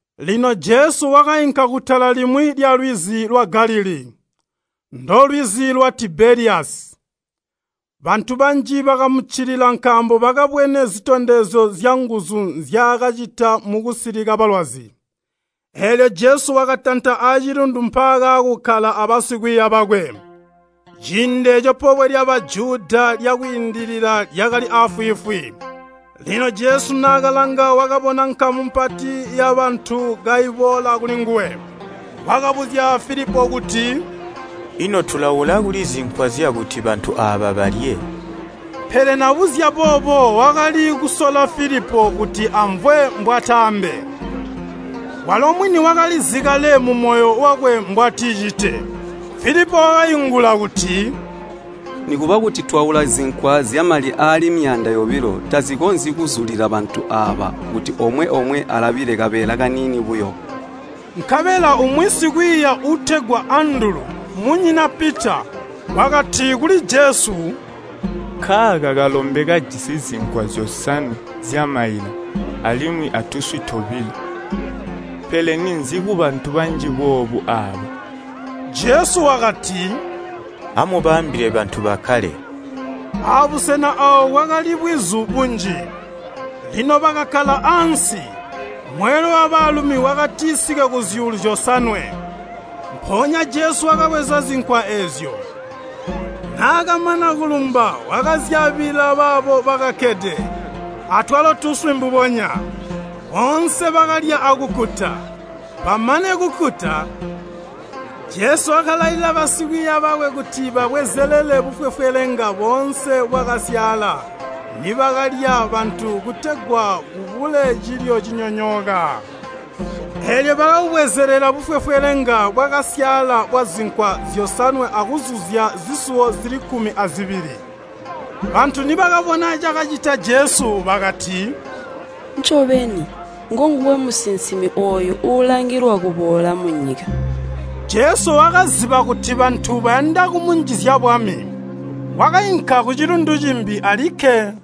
Lino Jesu wakainka kutala limwi lyalwizi lwa Galilii, ndolwizi lwa Tibeliyasi. Bantu banji bakamuccilila nkaambo bakabwene zitondezyo zyanguzu nzyaakacita mukusilika balwazi. Eelyo Jesu wakatanta acilundu mpaakaakukkala abasikwiiya bakwe. Ciindi eeco Pobwe lya Bajuda lya Kwiindilila lyakali aafwiifwi. Lino Jesu naakalanga wakabona nkamu mpati yabantu kaiboola kulinguwe. Wakabuzya Filipo kuti, “Ino tulaula kuli zinkwa zyakuti bantu aaba balye?” Pele nabuzya boobo wakali kusola Filipo kuti amvwe mbwataambe, walo mwini wakalizi kale mumoyo wakwe mbwaticite. Filipo wakaingula kuti, “Nikuba kuti twaula zinkwa zyamali aali myaanda yobilo tazikonzyi kuzulila bantu aaba kuti omwe-omwe alabile kabeela kaniini buyo.” Nkabela umwi sikwiiya uutegwa Andulu, munyina Pita, wakati kuli Jesu, “Nkaaka kalombe kajisi zinkwa zyosanwe zyamaila alimwi atuswi tobilo. Pele ninzi kubantu banji boobu aaba?” Jesu wakati, “Amubaambile bantu bakkale.” Abusena aawo kwakali bwizu bunji. Lino bakakkala ansi, mweelwe wabaalumi wakatisike kuzyuulu zyosanwe. Mpoonya Jesu wakabweza zinkwa eezyo, naakamana kulumba wakazyaabila baabo bakakkede. Atwalo tuswi mbubonya. Boonse bakalya akukkuta. Bamane kukkuta, Jesu wakalailila basikwiiya bakwe kuti babwezelele bufwefwelenga boonse bwakasyaala nibakalya bantu kutegwa kubule cilyo cinyonyooka. Eelyo bakabubwezelela bufwefwelenga bwakasyaala bwazinkwa zyosanwe akuzuzya zisuwo zili kkumi azibili. Bantu nibakabona cakacita Jesu bakati, “Ncobeni ngonguwe musinsimi ooyo uulangilwa kuboola munyika!” Jesu wakaziba kuti bantu bayanda kumunjizya bwami, wakainka kucilundu cimbi alikke.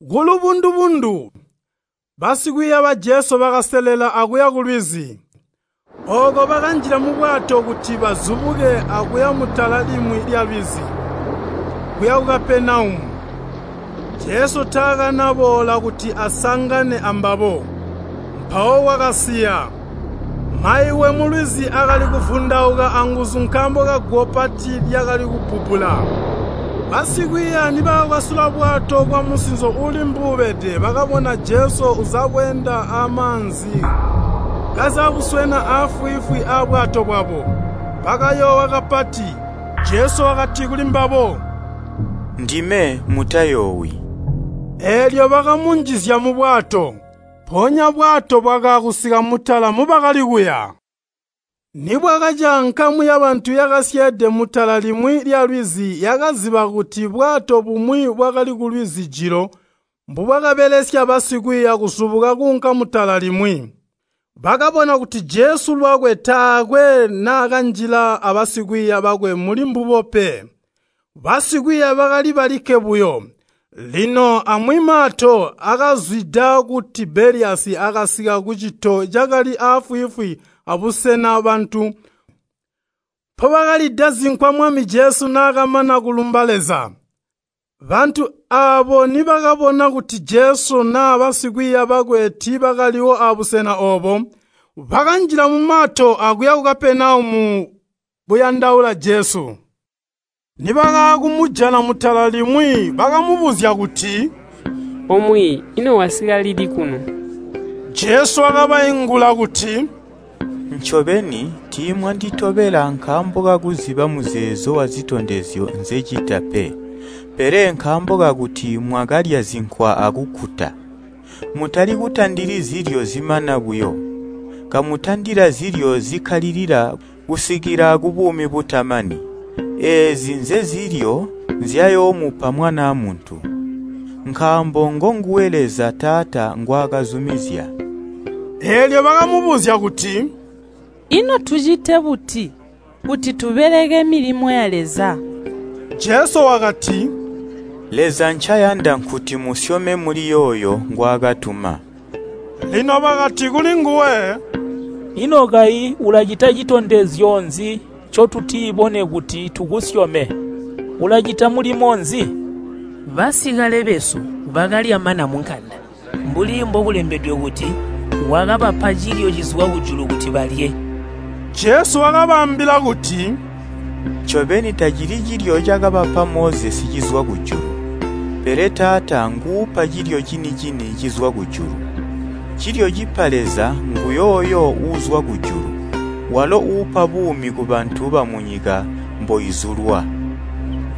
Kulubundu-bundu, basikwiiya ba Jesu bakaselela akuya kulwizi. Ooko bakanjila mubwato kuti bazubuke akuya mutala limwi lyalwizi, kuya ku Kapenaumu, Jesu taakanaboola kuti asangane ambabo. Mpawo kwakasiya. Mayuwe mulwizi akali kuvundauka anguzu nkaambo kaguwo pati lyakali kubbubbula. Basikwiiya nibakakwasula bwato kwamusinzo uuli mbuubede bakabona Jesu uzabweenda amaanzi kazabuswena aafwiifwi abwato bwabo. Bakayoowa kapati. Jesu wakati kulimbabo, “Ndime, mutayoowi.” Eelyo bakamunjizya mubwato, mpoonya bwato bwakaakusika mutala mubakali kuya. Nibwakaca nkamu yabantu yakasyeede mutala limwi lyalwizi yakaziba kuti bwato bumwi bwakali kulwizi jilo mbubwakabelesya basikwiiya kuzubuka kuunka mutala limwi. Bakabona kuti Jesu lwakwe taakwe naakanjila abasikwiiya bakwe muli mbubo pe. Basikwiiya bakali balikke buyo. Lino amwi mato aakazwida ku Tibeliyasi akasika kucito cakali aafwiifwi aabusena bantu mpobakalida zinkwa Mwami Jesu naakamana kulumba Leza. Bantu aabo nibakabona kuti Jesu naa basikwiiya bakwe tiibakaliwo abusena oobo, bakanjila mumato akuya ku Kapenaumu buyandaula Jesu. Nibakaakumujana mutala limwi, bakamubuzya kuti, “O Mwiiyi, ino wasika lili kuno?” Jesu wakabaingula kuti, “Ncobeni, tiimwanditobela nkaambo kakuziba muzeezo wazitondezyo nzecita pe, pele nkaambo kakuti mwakalya zinkwa akukkuta. Mutalikutandili zilyo zimana buyo, kamutandila zilyo zikkalilila kusikila kubuumi butamani. Eezi nzezilyo nzyayoomupa Mwanaa Muntu. Nkaambo ngonguwe Leza Taata ngwakazumizya.” Eelyo bakamubuzya kuti, “Ino tucite buti kuti tubeleke milimo ya Leza?” Jesu wakati, “Leza ncayanda nkuti musyome muli yooyo ngwaakatuma.” Lino bakati kulinguwe, “Ino kayi ulacita citondezyo nzi ncotutibone kuti tukusyome? Ulacita mulimo nzi? Basikale besu bakalya mana munkanda, mbuli mbokulembedwe kuti, ‘Wakabapa cilyo cizwa kujulu kuti balye!’” Jesu wakabaambila kuti, “Ncobeni tacili cilyo cakabapa Mozesi cizwa kujulu, pele Taata nguupa cilyo cini-cini cizwa kujulu. Cilyo cipa Leza nguyooyo uuzwa kujulu, walo uupa buumi kubantu bamunyika mboizulwa.”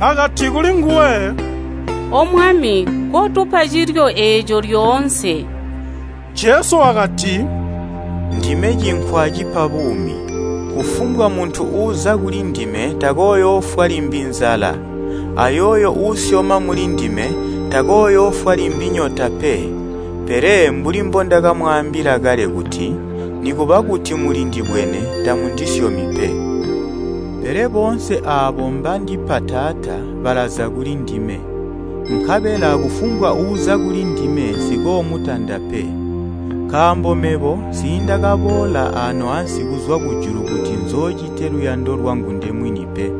Bakati kulinguwe, “O Mwami, kotupa cilyo eeco lyoonse.” Jesu wakati, “Ndime cinkwa cipa buumi. Kufumbwa muntu uuza kulindime takooyoofwa limbi nzala, ayooyo uusyoma mulindime, takooyoofwa limbi nyota pe. Pele mbuli mbondamwaambila kale kuti, nikuba kuti mulindibwene, tamundisyomi pe. Pele boonse aabo mbandipa Taata balaza kulindime, nkabela kufumbwa uuza kulindime nsikoomutanda pe. Nkaambo mebo nsiindakaboola ano ansi kuzwa kujulu kuti nzoocite luyando lwangu ndemwini pe.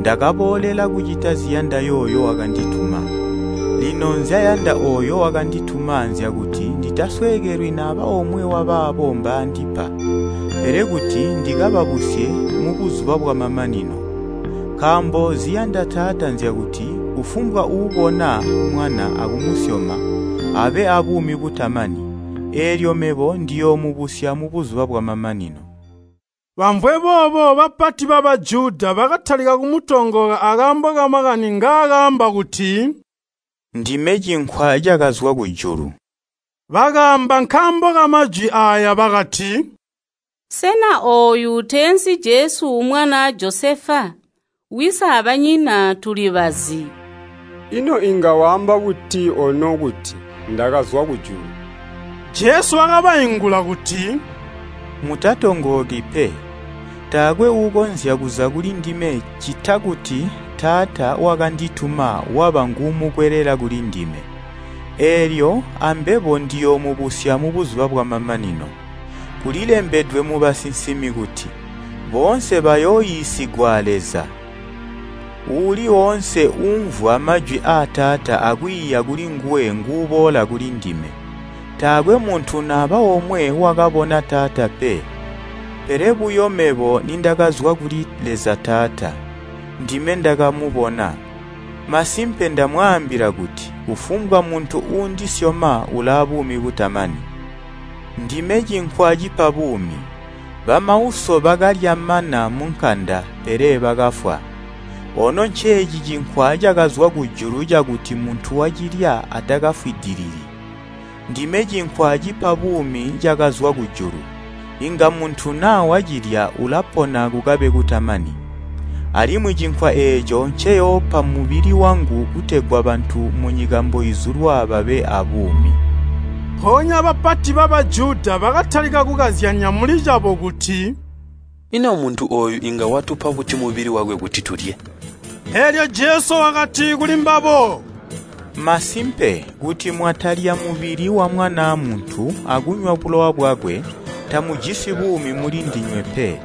Ndakaboolela kucita ziyanda yooyo wakandituma. Lino nzyayanda ooyo wakandituma nzyakuti nditasweekelwi naba omwe wa baabo mbaandipa, pele kuti ndikababusye mubuzuba bwamamanino. Nkaambo ziyanda Taata nzyakuti kufumbwa uubona mwana akumusyoma abe aabuumi butamani, eelyo mebo ndiyoomubusya mubuzuba bwamamanino.” Bamvwe boobo bapati ba Bajuda bakatalika kumutongooka akaambo kamakani ngaakaamba kuti, “Ndime cinkwa cakazwa kujulu.” Bakaamba nkaambo kamajwi aaya bakati, “Sena ooyu teensi Jesu mwanaa Josefa? Wisi abanyina tulibazi. Ino inga waamba buti ono kuti, ‘Ndakazwa kujulu?’” Jesu wakabaingula kuti, “Mutatongooki pe. Taakwe uukonzya kuza kulindime ccita kuti Taata wakandituma waba nguumukwelela kulindime. Eelyo ambebo ndiyoomubusya mubuzuba bwamamanino. Kulilembedwe mubasinsimi kuti, ‘Boonse bayooiisigwa a Leza.’ Uuli oonse uumvwa majwi aa Taata akwiiya kulinguwe nguuboola kulindime. Taakwe muntu naba omwe wakabona Taata pe, pele buyo mebo nindakazwa kuli Leza Taata, ndime ndakamubona. “Masimpe, ndamwaambila kuti kufumbwa muntu uundisyoma ulaabuumi butamani. Ndime cinkwa cipa buumi. Bamauso bakalya mana munkanda, pele bakafwa. Ono nceeci cinkwa cakazwa kujulu cakuti muntu wacilya atakafwidilili. Ndime cinkwa cipa buumi cakazwa kujulu. Inga muntu naa wacilya ulapona kukabe kutamani. Alimwi cinkwa eeco nceyoopa mmubili wangu kutegwa bantu munyika mboizulwa babe aabuumi.” Mpoonya bapati ba Bajuda bakatalika kukazyanya mulicabo kuti, “Ino muntu ooyu inga watupa buti mubili wakwe kuti tuulye?” Eelyo Jesu wakati kuli mbabo, “Masimpe kuti mwatalya mubili wa Mwanaa Muntu akunywa bulowa bwakwe, tamujisi buumi muli ndinywe pe.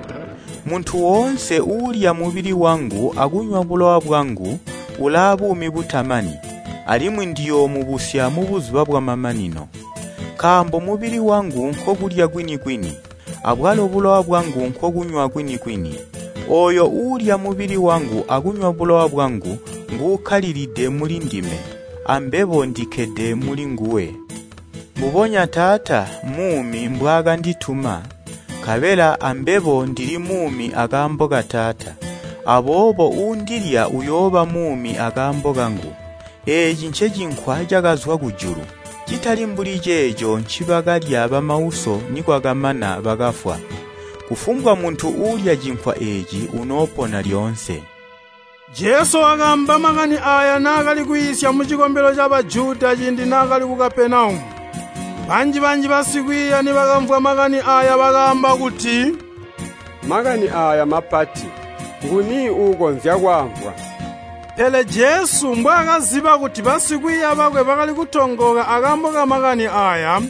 Muntu woonse uulya mubili wangu akunywa bulowa bwangu ulaabuumi butamani, alimwi ndiyoomubusya mubuzuba bwamamanino. Nkaambo mubili wangu nkokulya kwini-kwini abwalo bulowa bwangu nkokunywa kwini-kwini. Ooyo uulya mubili wangu akunywa bulowa bwangu nguukkalilide muli ndime, ambebo ndikkede muli nguwe. Mbubonya Taata muumi mbwaakandituma, nkabela ambebo ndili muumi akaambo ka Taata. Aboobo uundilya uyooba muumi akaambo kangu. Eeci ncecinkwa cakazwa kujulu, citali mbuli ceeco ncibakalya bamauso nikwakamana bakafwa. Kufumbwa muntu uulya cinkwa eeci unoopona lyoonse.” Jesu wakaamba makani aaya naakali kwiisya mucikombelo ca Bajuda ciindi naakali ku Kapenaumu. Banji-banji basikwiiya nibakamvwa makani aaya bakaamba kuti, “Makani aaya mmapati. Nguni uukonzya kwaamvwa?” Pele Jesu, mbwaakaziba kuti basikwiiya bakwe bakali kutongooka akaambo kamakani aaya,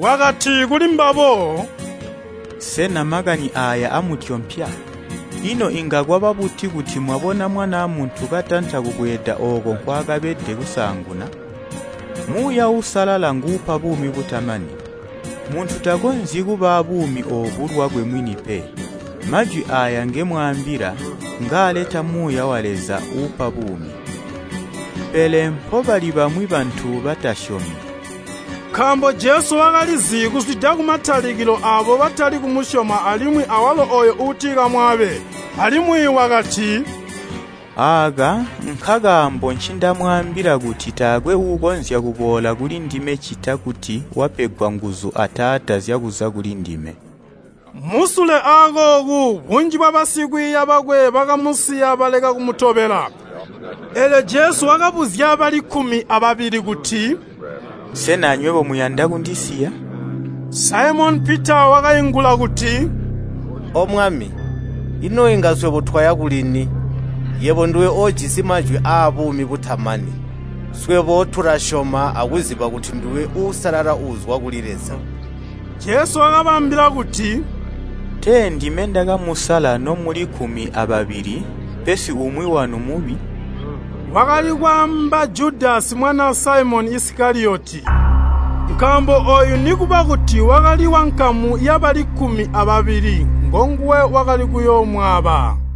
wakati kuli mbabo, “Sena makani aaya amutyompya? Ino inga kwaba buti kuti mwabona Mwanaa Muntu katanta kubweeda ooko nkwaakabede kusaanguna? Muuya Uusalala nguupa buumi butamani. Muntu takonzyi kuba abuumi oobu lwakwe mwini pe. Majwi aaya ngemwaambila ngaaleta Muuya wa Leza uupa buumi. Pele mpobali bamwi bantu batasyomi.” Nkaambo Jesu wakalizi kuzwida kumatalikilo aabo batali kumusyoma alimwi awalo ooyo uutikamwaabe. Alimwi wakati, “Aaka nkakaambo ncindamwaambila kuti taakwe uukonzya kuboola kulindime ccita kuti wapegwa nguzu a Taata zyakuza kulindime.” Musule akooku bunji bwabasikwiiya bakwe bakamusiya baleka kumutobela. Eelyo Jesu wakabuzya bali kkumi ababili kuti, “Sena anywebo muyanda kundisiya?” Saimoni Pita wakaingula kuti, “O Mwami, ino inga swebo twaya kulini? Yebo nduwe oojisi majwi aabuumi butamani. Swebo tulasyoma, akuziba kuti nduwe Uusalala uuzwa kuli Leza.” Jesu wakabaambila kuti, “Tee ndime ndakamusala nomuli kkumi ababili, pesi umwi wanu mmubi.” Wakali kwaamba Judasi mwanaa Saimoni Isikaliyoti, nkaambo ooyu nikuba kuti wakali wankamu yabali kkumi ababili ngonguwe wakali kuyoomwaaba.